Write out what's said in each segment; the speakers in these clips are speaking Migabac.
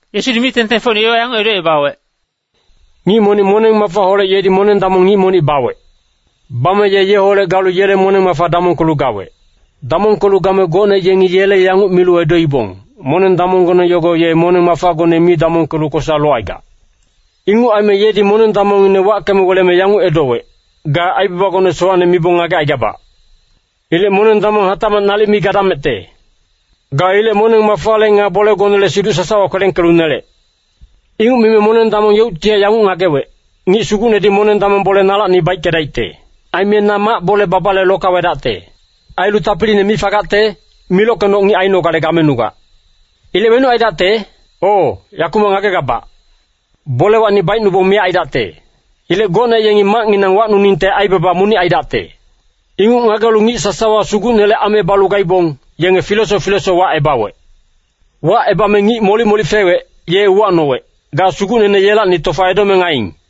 Yesudi mic-tengtengfocine yowa yanguc edocebawec, “Ngic monic moneng-mafaholec yedi moneng-damong ngic monic bawec. Bame ye yeholec galu yele moneng-mafa damongkelu gawec. Damongkelu game gocne yengi yele yanguc milu edoibong, ‘Moneng-damonggone yogo ye moneng-mafagone mi damongkelu kosa locaigac.’ “Inguc aime yedi moneng-damongngine wackeme weleme yanguc edowec, ‘Ga aibabagone sowacne mibong ngagecaigabac. Ilec moneng-damong hatacmac nalic mi gadamecte. Ga ilec moneng-mafale nga bolegonele siduc sasawa kwelengkelu nelec.’ “Inguc mime moneng-damong yeuctihac yanguc ngagewec, ‘Ngic sugucnedi moneng-damong bole nalacni baickedaicte. Aime na mac bole-babale lokawedacte. Ailu tapiline mi fagacte, milockenoc ngic ainogale gamenugac. Ilec wenuc aidacte? O, yakumac ngagegabac. Bolewacni baicnubong miyac aidacte. Ilec gocne yengi macnginang wacnuningte aibaba monic aidacte.’ “Inguc ngagelu ngic sasawa sugucnele ame balu gaibong, yenge filesoc filesoc wacebawec. Wacebame ngic molic-molic fewec, ye uwacnowec, ‘Ga sugucnene yelacni tofa edomeng aiing?’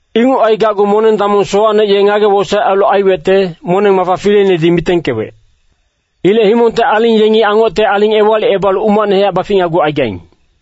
“Inguc aigacgu moneng-damong sowacne ye ngage-wosaec ailu aiwecte, moneng-mafa fileinedi mitengkewec. Ilec himongte aling yengi angocte aling ewalicebalu umacnehac baficnagucaigaing.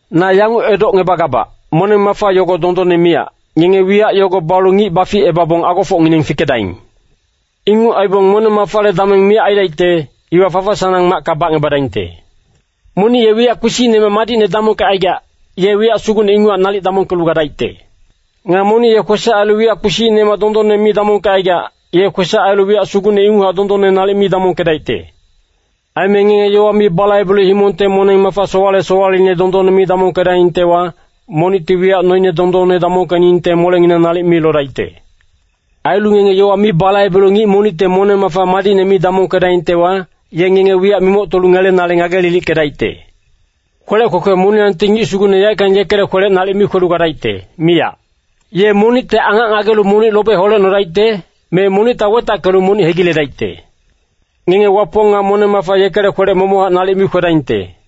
“Na yanguc edocngebagabac, moneng-mafa yogo dondonne miyac, ngenge wiyac yogo balu ngic baficebabong agofocngineng fikedaing. Inguc aibong moneng-mafale dameng miyac aidaicte, iwa fafa-sanang macka bacngebadaingte. “Monic ye wiyac kpisicnemac madicne damongkecaigac, ye wiyac sugucne inguchac nalic damongkelu gadaicte. Nga monic ye kwesac ailu wiyac kpisicnemac dondonne mi damongkecaigac, ye kwesac ailu wiyac sugucne inguchac dondonne nalic mi damongkedaicte. Aime ngenge yowa mi balaibelu himongte moneng-mafa sowale-sowaleine dondonne mi damongkedaingtewa, monicti wiyac noine dondonne damongkeningte molenginang nalic mi lodaicte. Ailu ngenge yowa mi balaibelu ngic monicte moneng-mafa madicne mi damongkedaingtewa, ye ngenge wiyac mimoctolu ngelenale ngage-lilickedaicte. “Kwelec kwekwe moniyangti ngic sugucne yaeckang yekele kwelec nalic mi kwelu gadaicte, miyac. Ye monicte angac ngagelu monic lobe holecnodaicte, me monicta wetackelu monic hegiledaicte. Ngenge Wapong nga moneng-mafa yekele kwelec momochac nalic mi kwedaingte.”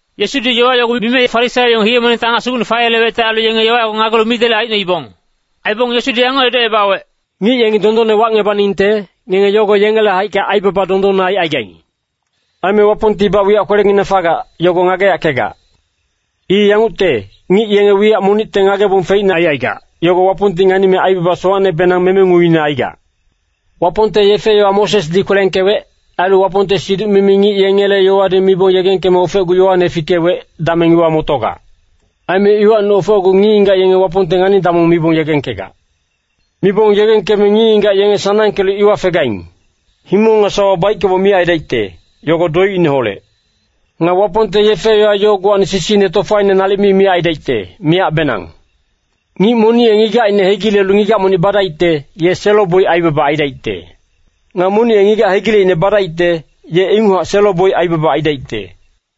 Yesudi yowa yogo mime Farisaio yenge hiye-monengte angac sugucne fayelewecte ailu, yogo ngagelu midelec aicnoibong. Aibong Yesudi yanguc edocebawec, “Ngic yengi dondonne wacngebaningte, ngenge yogo yengele haicka aibaba dondonne aicaigaing. Aime Wapongtibac wiyac kwelenginang fagac, yogo ngageyackegac. I yangucte, ngic yenge wiyac monicte ngagebong feicne aicaigac, yogo Wapongti nganime aibaba sowacnebenang memenguine aigac. “Wapongte yefe-yowa Mosesdi kwelengkewec, ailu Wapongte siduc-mimi ngic yengele yowadi mibong yegengkeme ofecgu Yoane fikewec, dameng iwa motogac. Aime iwacni ofecgu ngic-ngigac yenge Wapongte ngani-damong mibong yegengkegac. Mibong yegengkeme ngic-ngigac yenge sanangkelu iwa fegaing. Himong nga sawa baickeboc miyac aidaicte, yogo doicineholec. Nga Wapongte yefe-yowa yogowacni sisine tofaine nalic mi miyac aidaicte, miyacbenang. Ngic monic ye ngigacine hegilelu ngigac monic badaicte, ye selo-boic aibaba aidaicte. Nga monic ye ngigac hegileicne badaicte, ye inguchac selo-boic aibaba aidaicte.”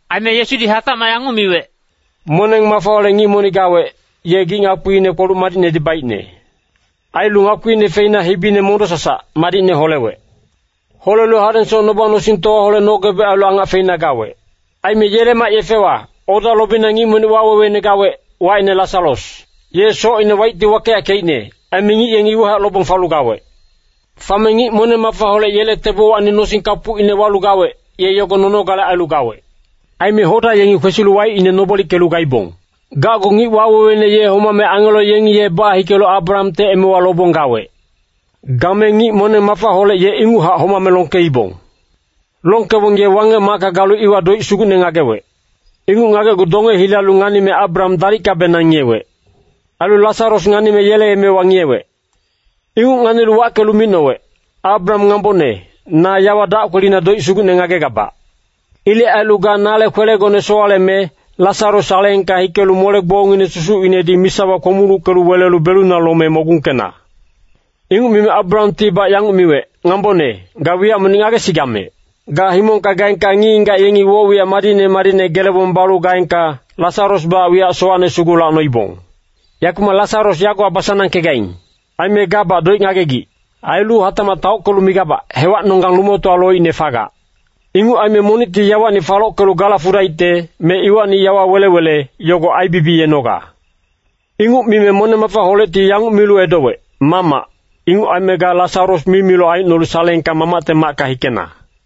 Aime Yesudi hatacmac yanguc miwec,“Moneng-mafaholec ngic monic gawec, ye gic-ngakpiine kpoluc madicnedi baicne. Ailu ngakpiine feina hibine mondo-sasac, madicne holewec. Holelu hadengsoc noba-nosingtowaholec nogebec ailu angac feina gawec. Aime yele mac-yefewa, oda lobina ngic monic waweweine gawec, wacine Lasaros. Ye socine waicti wakeyackeicne, aime ngic yengi iwahac lobong falu gawec. Fame ngic moneng-mafaholec yele tebowacni nosing kapucine walu gawec, ye yogo nonogale ailu gawec. Aime hoda yengi kwesilu waicine nobolickelu gaibong. “Gacgu ngic waweweine ye homame angelo yengi ye bahikelu Abrahamte emewa lobong gawec. Game ngic moneng-mafaholec ye inguchac homame longkeibong. Longkebong ye Wangec-macka galu iwa doic sugucne ngagewec. Inguc ngagecgu donge hilalu nganime Abraham dalickabenang ngiyewec. Ailu Lasaros nganime yele emewa ngiyewec. Inguc nganilu wackelu micnowec, ‘Abraham ngambone, na yawa dac kwelina doic sugucne ngagegabac. Ilec ailu ga nale kwelegone sowaleme, Lasaros saleengka hikelu mole-gbongngine susucinedi misawa kpomulucke welelu beluna lome mogungkena.’ “Inguc mime Abrahamtibac yanguc miwec, ‘Ngambone, ga wiyac monic ngagesigamec. Ga himongka gaengka ngic-ngigac yengi woc-wiyac madicne madicne gelebong balu gaengka, Lasarosbac wiyac sowacne sugu lacnoibong. Yakumac Lasaros yagowa basanangkegaing. Aime gabac doic ngagegic. Ailu hatacmac taockelu migabac, hewacnonggang lumotowa loicne fagac. Inguc aime monicti yawacni falockelu gala fudaicte, me iwacni yawa wele-wele, yogo aibibiyenoga.’ “Inguc mime moneng-mafaholecti yanguc milu edowec, ‘Mamac, inguc aime ga Lasaros mimiloc aicnolu saleengka mamacte macka hikena.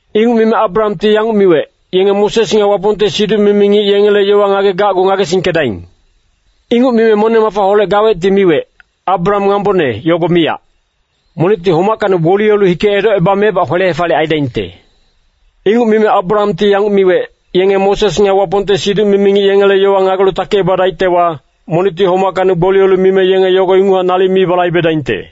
“Inguc mime Abrahamti yanguc miwec, ‘Yenge Moses nga Wapongte siduc-mimi ngic yengele yowa ngagegacgu ngagesingkedaing.’ “Inguc mime moneng-mafaholec gawecti miwec, ‘Abraham ngambone, yogo miyac. Monicti homackacni gboliyelu hike edocebamebac kwele-hefaliyec aidaingte.’ “Inguc mime Abrahamti yanguc miwec, ‘Yenge Moses nga Wapongte siduc-mimi ngic yengele yowa ngagelu takicebadaictewa, monicti homackacni gboliyelu mime yenge yogo inguchac nalic mi balaibedaingte.’”